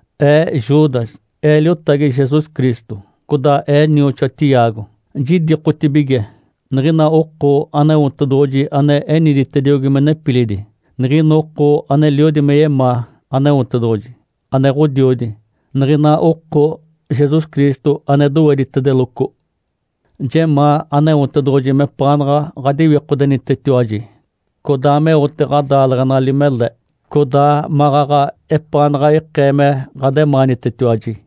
Ee Judas, ee liotagi Jesus Cristo, codaa ee nioxoa Tiago. Jidikotibige niɡ̶ina oko Aneotedoɡ̶oji ane eniditediogi me nepilidi, niɡ̶ina oko aneliodi me yemaa Aneotedoɡ̶oji, ane Ǥodiodi, niɡ̶ina oko Jesus Cristo ane doweditedeloco. Jemaa Aneotedoɡ̶oji mepaanaɡ̶a ɡ̶adiwikodenitetiwaji, codaa meote ɡ̶adaaleɡ̶enali mele, codaa maɡ̶aɡ̶a epaanaɡ̶a ikee me ɡ̶ademaanitetiwaji.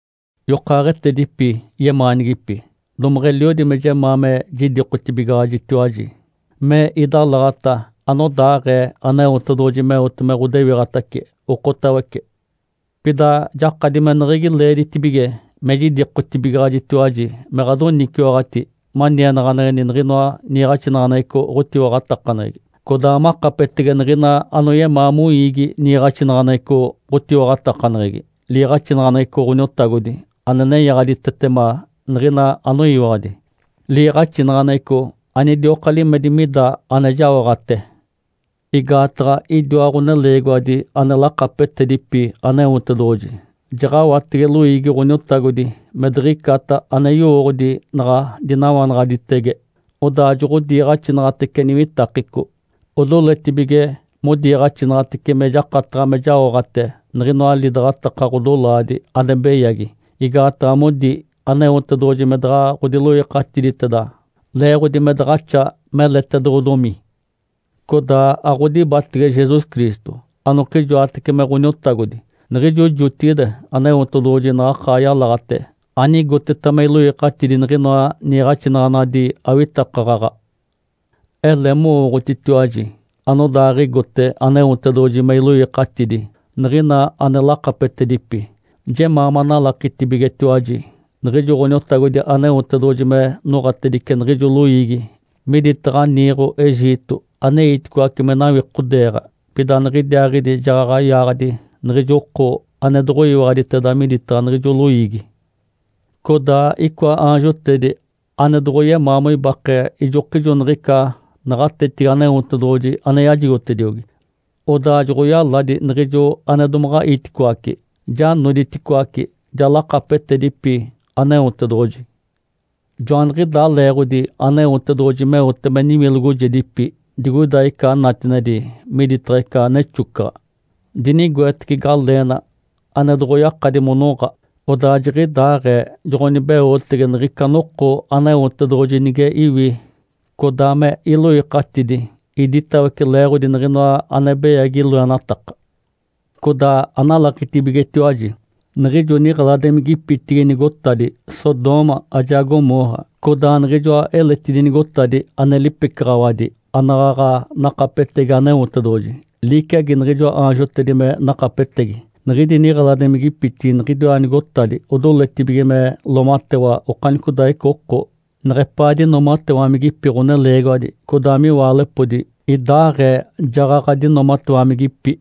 Yokaaɡ̶etedipi yemaanigipi, domaɡ̶a eliodi me jemaa me jidikotibigaɡ̶ajitiwaji me idalaɡ̶ata anodaaɡ̶ee Aneotedoɡ̶oji meote me ɡ̶odewiɡ̶atace okotawece. Pida jakadi meneɡ̶egi leeditibige me jidikotibigaɡ̶ajitiwaji me ɡ̶adoniciwaɡ̶ati manienaɡ̶aneɡ̶eni niɡ̶inoa niiɡ̶axinaɡ̶aneɡ̶eco ɡ̶otiwaɡ̶atakaneɡ̶egi, codaa makapetege niɡ̶ina anoyemaa moiigi niiɡ̶axinaɡ̶aneɡ̶eco ɡ̶otiwaɡ̶atakaneɡ̶egi, liiɡ̶axinaɡ̶aneɡ̶eco Ǥoniotagodi ane nenyaɡ̶aditetema niɡ̶ina anoyiwaɡ̶adi, liiɡ̶axinaɡ̶aneɡ̶eco anidioka limedi mida ane jaoɡ̶ate. Igaataɡ̶a idiwa ɡ̶oneleegiwadi ane lakapetedipi Aneotedoɡ̶oji jaɡ̶awatege loiigi Ǥoniotagodi me diɡ̶icata ane yowooɡ̶odi naɡ̶a dinawanaɡ̶aditege, odaa joɡ̶odiiɡ̶axinaɡ̶atece niwitakeco, odoletibige modiiɡ̶axinaɡ̶atece me jakataɡ̶a me jaoɡ̶ate niɡ̶inoa lidaɡ̶ataka ɡ̶odolaadi ane beyagi, igaataɡ̶a modi Aneotedoɡ̶oji me daɡ̶a ɡ̶odiloikatiditeda leeɡ̶odi me daɡ̶axa meletedoɡ̶odomi. Codaa aɡ̶odibatege Jesus Cristo, anokijoatece me Ǥoniotagodi. Niɡ̶ijo jotigide Aneotedoɡ̶oji naɡ̶akaa yalaɡ̶ate anigoteta me iloikatidi niɡ̶inoa niiɡ̶axinaɡ̶anadi awitakaɡ̶aɡ̶a. Ele mowooɡ̶otitiwaji anodaaɡ̶igote Aneotedoɡ̶oji me iloikatidi niɡ̶ina ane lakapetedipi, jemaa manalakitibigetiwaji niɡ̶ijo Ǥoniotagodi Aneotedoɡ̶oji me noɡ̶atedice niɡ̶ijo loiigi miditaɡ̶a niiɡ̶o Egito aneiticoace me nawikodeeɡ̶a, pida niɡ̶idiaaɡ̶idi jaɡ̶aɡ̶a yaaɡ̶adi niɡ̶ijo oko ane doɡ̶oyiwaɡ̶aditeda miditaɡ̶a niɡ̶ijo loiigi. Codaa icoa aanjotedi ane doɡ̶oyemaa moibake ijokijo niɡ̶ica naɡ̶atetigi Aneotedoɡ̶oji ane yajigotediogi, odaa joɡ̶oyaladi niɡ̶ijo ane domaɡ̶a iticoace, ja noditicoaci, ja lakapetedipi Aneotedoɡ̶oji. Joaniɡ̶idaa leeɡ̶odi Aneotedoɡ̶oji meote me niwilogojedipi digoida ica natinedi miditaɡ̶a ica nexocaɡ̶a, dinigoetece galeena ane doɡ̶oyakadi monoɡ̶a. Odaa jiɡ̶idaaɡ̶ee joɡ̶onibeotege niɡ̶ica noko Aneotedoɡ̶oji nige iwi codaa me iloikatidi iditawece leeɡ̶odi niɡ̶inoa ane beyagi loenataka. Codaa analakitibigetiwaji niɡ̶ijo niɡ̶eladimigipitigi nigotadi Sodoma ajaa Gomorra, codaa niɡ̶ijoa eletidi nigotadi ane lipecaɡ̶awadi anaɡ̶aɡ̶a nakapetegi Aneotedoɡ̶oji liciagi niɡ̶ijoa aanjotedi me nakapetegi. Niɡ̶idi niɡ̶eladimigipitigi niɡ̶idiwa nigotadi odoletibige me loomatewa okanicodaaɡ̶ica oko, neɡ̶epaa dinoomatewamigipi ɡ̶oneleegiwadi, codaa miwaalepodi idaaɡ̶ee jaɡ̶aɡ̶a dinoomatewamigipi.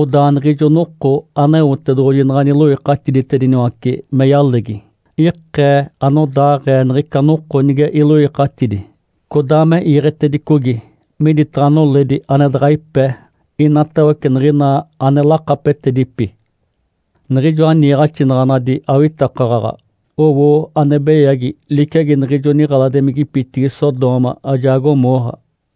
Odaa niɡ̶ijo noko Aneotedoɡ̶oji naɡ̶a niloikatiditediniwace me yalegi, ikee anodaaɡ̶ee niɡ̶ica noko nige iloikatidi codaa me iiɡ̶etedicogi miditaɡ̶a noledi ane daɡ̶a ipe inatawece niɡ̶ina ane lakapetedipi. Niɡ̶ijoa niiɡ̶axinaɡ̶anadi awitakaɡ̶aɡ̶a owo ane beyagi liciagi niɡ̶ijo niɡ̶eladimigipitigi Sodoma ajaa Gomorra.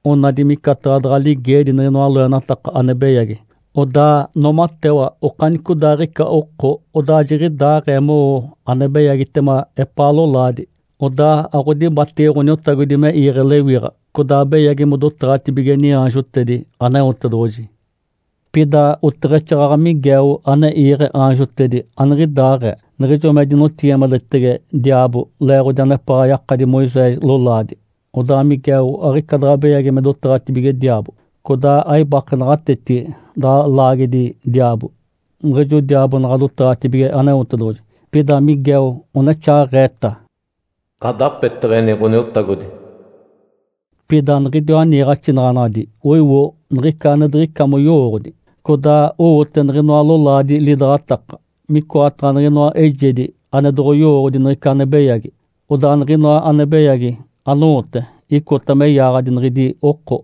Onadi micataɡ̶a daɡ̶a ligeedi niɡ̶inoa loenataka ane beyagi. Odaa noomatewa okanicodaaɡ̶ica oko, odaa jiɡ̶idaaɡ̶ee mowo ane beyagitema epaa lolaadi. Odaa aɡ̶odibatege Ǥoniotagodi me iiɡ̶e lewiɡ̶a, codaa beyagi modotaɡ̶atibige niaanjotedi Aneotedoɡ̶oji. Pida oteɡ̶exaaɡ̶aɡ̶a Miguel ane iiɡ̶e aanjotedi aniɡ̶idaaɡ̶ee. Niɡ̶ijo me dinotigimadetege diaabo leeɡ̶odi anepaɡ̶a yakadi Moisés lolaadi, odaa Miguel aɡ̶ica daɡ̶a beyagi me dotaɡ̶atibige diaabo, codaa aibake naɡ̶atetigi daɡ̶a laagedi diaabo niɡ̶ijo diaabo naɡ̶a dotaɡ̶atibige Aneotedoɡ̶oji. Pida Miguel onexaaɡ̶eeta, “Ǥadapeteɡ̶eni Ǥoniotagodi.” Pida niɡ̶idiwa niiɡ̶axinaɡ̶anadi oiwo niɡ̶ica ane diɡ̶ica moyowooɡ̶odi. Codaa owote niɡ̶inoa lolaadi lidaɡ̶ataka, micoataɡ̶a niɡ̶inoa eijedi ane doɡ̶oyowooɡ̶odi niɡ̶ica ane beyagi, odaa niɡ̶inoa ane beyagi anowote icota me yaaɡ̶adi niɡ̶idi oko.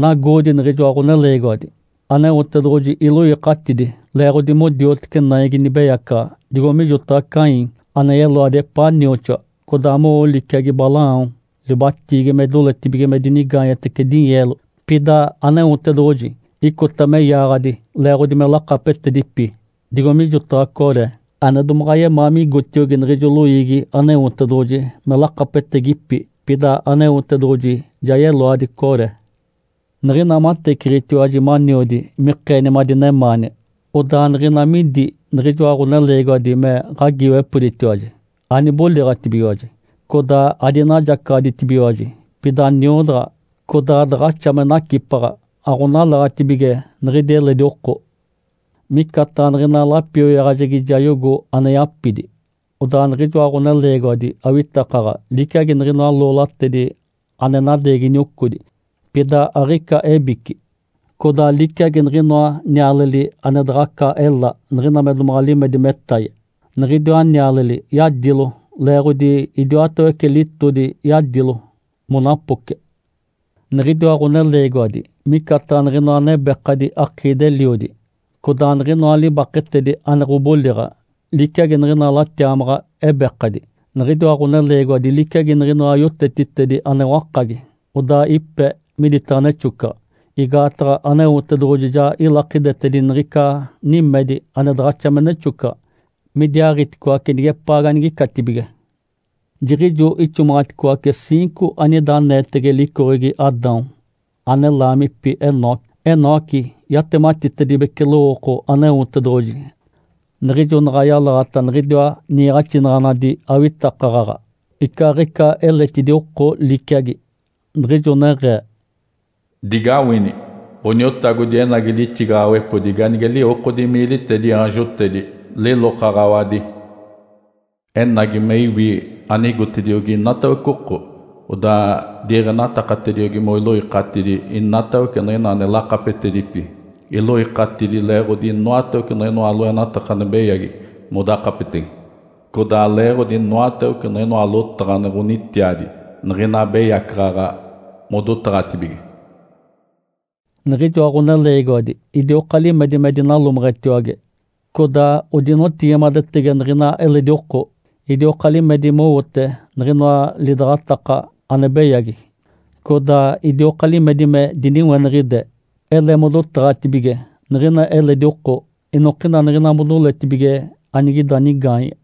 Nagoodi niɡ̶ijoa ɡ̶oneleegiwadi! Aneotedoɡ̶oji iloikatidi leeɡ̶odi modioteci naigi nibeyacaɡ̶a digo mijotaɡ̶a Caim ane yeloadi epaa nioxoa, codaa mowo liciagi Balaão libatiigi me doletibige me dinigaanyetece dinyeelo. Pida Aneotedoɡ̶oji icota me yaaɡ̶adi leeɡ̶odi me lakapetedipi digo mijotaɡ̶a Coré ane domaɡ̶a yemaa migotiogi niɡ̶ijo loiigi Aneotedoɡ̶oji me lakapetegipi, pida Aneotedoɡ̶oji ja yeloadi Coré. Niɡ̶ina mateciɡ̶itiwaji maniodi mikeeni madinemaani, odaa niɡ̶ina midi niɡ̶ijoa ɡ̶oneleegiwadi me ɡ̶agiiwepoditiwaji, aniboliɡ̶atibigiwaji. Codaa adinajacaɡ̶aditibigiwaji, pida niodaɡ̶a, codaa daɡ̶axa me nacipaɡ̶a aɡ̶onalaɡ̶atibige niɡ̶idi eledi oko. Micataɡ̶a niɡ̶ina lapioyaɡ̶ajegi jayogo ane yapidi. Odaa niɡ̶ijoa ɡ̶oneleegiwadi awitakaɡ̶aɡ̶a liciagi niɡ̶inoa loolatedi ane nadeegi niocodi, pida aɡ̶ica ebici, codaa liciagi niɡ̶inoa nialeli ane daɡ̶aca ela niɡ̶ina me domaɡ̶a limedi metaye, niɡ̶idiwa nialeli yadilo leeɡ̶odi idiwatawece litodi yadilo monapoce. Niɡ̶idiwa ɡ̶oneleegiwadi micataɡ̶a niɡ̶inoa nebekadi akiidi-eliodi, codaa niɡ̶inoa libaketedi ane ɡ̶oboliɡ̶a liciagi niɡ̶ina latiamaɡ̶a ebekadi. Niɡ̶idiwa ɡ̶oneleegiwadi liciagi niɡ̶inoa yotetitedi ane wakagi, odaa ipe miditaɡ̶a nexocaɡ̶a, igaataɡ̶a Aneotedoɡ̶oji ja ilakidetedi niɡ̶ica nimedi ane daɡ̶axa me nexocaɡ̶a midiaaɡ̶iticoace nigepaa ganigicatibige. Jiɡ̶ijo ixomaɡ̶aticoace ciinco anida aneetege licoɡ̶egi Adão, ane laamipi Enoque. Enoque yatematitedibece lowooko Aneotedoɡ̶oji niɡ̶ijo naɡ̶a yalaɡ̶ata niɡ̶idiwa niiɡ̶axinaɡ̶anadi awitakaɡ̶aɡ̶a icaaɡ̶ica eletidi oko liciagi, niɡ̶ijo neɡ̶ee, “Digawini! Ǥoniotagodi enagi lixigaɡ̶awepodi ganige liwokodi miilitedi aanjotedi lilokaɡ̶awadi. Enagi me iwi anigotediogi inatawece oko, odaa diiɡ̶enatakatediogi moiloikatidi inatawece niɡ̶ina ane lakapetedipi. Iloikatidi leeɡ̶odi inoatawece niɡ̶inoa loenataka ane beyagi modakapetege, codaa leeɡ̶odi inoatawece niɡ̶inoa lotaɡ̶a ane ɡ̶onitiadi niɡ̶ina abeyacaɡ̶aɡ̶a modotaɡ̶atibige.” Niɡ̶ijoa ɡ̶oneleegiwadi idioka limedi me dinalomeɡ̶etiwage, codaa odinotigimadetege niɡ̶ina eledi oko. Idioka limedi mowote niɡ̶inoa lidaɡ̶ataka ane beyagi, codaa idioka limedi me diniweniɡ̶ide. Ele modotaɡ̶atibige niɡ̶ina eledi oko inokina niɡ̶ina modoletibige anigida nigaanye.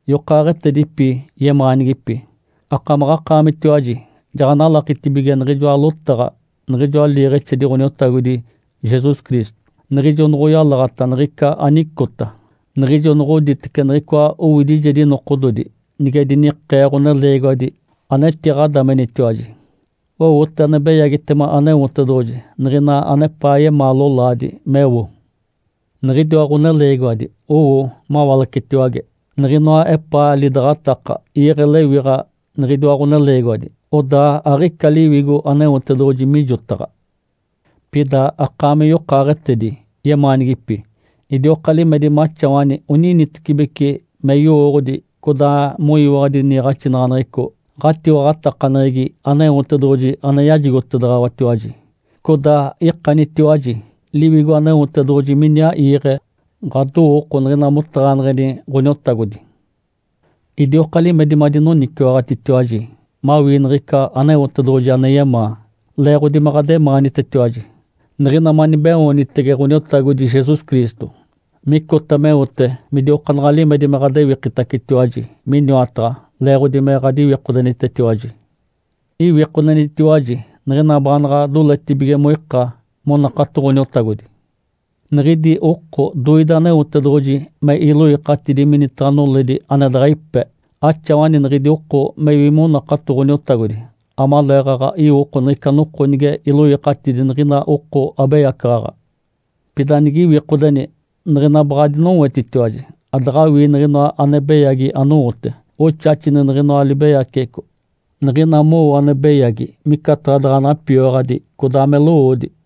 Yokaaɡ̶etedipi yemaanigipi, akamaɡ̶akaamitiwaji jaɡ̶analakitibige niɡ̶ijoa lotaɡ̶a niɡ̶ijoa liiɡ̶exedi Ǥoniotagodi Jesus Cristo, niɡ̶ijo noɡ̶oyalaɡ̶ata niɡ̶ica anicota, niɡ̶ijo noɡ̶oditece niɡ̶icoa owidijedi nokododi nige dinikee ɡ̶oneleegiwadi anetiɡ̶adamenitiwaji. Owote ane beyagitema Aneotedoɡ̶oji niɡ̶ina anepaa yemaa lolaadi meo. Niɡ̶idiwa ɡ̶oneleegiwadi owo mawalacetiwage. Niɡ̶inoa epaa lidaɡ̶ataka iiɡ̶e lewiɡ̶a niɡ̶idiwa ɡ̶oneleegiwadi, odaa aɡ̶ica Liwigo Aneotedoɡ̶oji mijotaɡ̶a. Pida, akaami yokaaɡ̶etedi yemaanigipi, idioka limedi maxawani oninitecibeci me yowooɡ̶odi codaa moyiwaɡ̶adi niiɡ̶axinaɡ̶aneɡ̶eco ɡ̶atiwaɡ̶atakaneɡ̶egi Aneotedoɡ̶oji ane yajigotedaɡ̶awatiwaji. Codaa ikanitiwaji Liwigo Aneotedoɡ̶oji miniaa iiɡ̶e ɡ̶adowooko niɡ̶ina motaɡ̶aneɡ̶eni Ǥoniotagodi. Idioka limedi madinoniciwaɡ̶atitiwaji mawii niɡ̶ica Aneotedoɡ̶oji ane yemaa leeɡ̶odi me ɡ̶ademaanitetiwaji, niɡ̶ina manibeoonitege Ǥoniotagodi Jesus Cristo micota meote midiokaanaɡ̶a limedi me ɡ̶adewikitiwaji miniwataɡ̶a leeɡ̶odi me ɡ̶adiwikodenitetiwaji. Iwikodenitiwaji niɡ̶ina baanaɡ̶a doletibige moika monakato Ǥoniotagodi. Niɡ̶idi oko doide Aneotedoɡ̶oji me iloikatidi minitaɡ̶a noledi ane daɡ̶a ipe, axawani niɡ̶idi oko mewi monakato Ǥoniotagodi amaleeɡ̶aɡ̶a iwoko niɡ̶ica noko nige iloikatidi niɡ̶ina oko abeyacaɡ̶aɡ̶a. Pida nigiwikodeni, niɡ̶ina baɡ̶a adinowetitiwaji adaɡ̶awii niɡ̶inoa ane beyagi anowote. Oxaxini niɡ̶inoa libeyaceɡ̶eco. Niɡ̶ina mowo ane beyagi, micataɡ̶a daɡ̶a napioyaɡ̶adi codaa me lowoodi.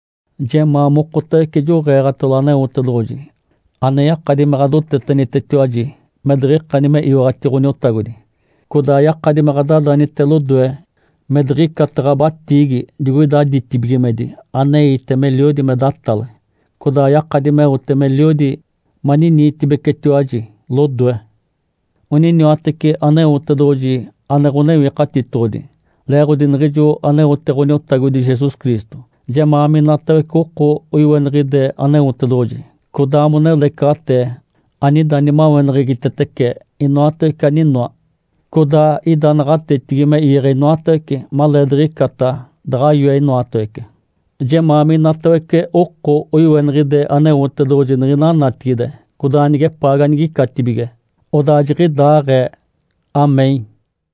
Jemaa mokotawece joɡ̶eeɡ̶atalo Aneotedoɡ̶oji ane yakadi me ɡ̶adotetenitetiwaji me diɡ̶ikani me iwaɡ̶ati Ǥoniotagodi, codaa yakadi me ɡ̶adadanite lodoe me diɡ̶icata ɡ̶abatiigi digoida ditibigimedi aneite meliodi me datale, codaa yakadi meote meliodi maniniitibecetiwaji lodoe. Oniniwatece Aneotedoɡ̶oji ane Ǥonewikatitoɡ̶odi. Leeɡ̶odi niɡ̶ijo aneote Ǥoniotagodi Jesus Cristo, jemaa minatawece oko oiweniɡ̶ide Aneotedoɡ̶oji, codaa monelecaɡ̶atee, anida nimaweneɡ̶egitetece inoatawece aninoa, codaa ida naɡ̶atetigi me iiɡ̶e inoatawece maleediɡ̶icata daɡ̶a yoe inoatawece. Jemaa minatawece oko oiweniɡ̶ide Aneotedoɡ̶oji niɡ̶ina natigide codaa nigepaa ganigicatibige. Odaa jiɡ̶idaaɡ̶ee. Amém.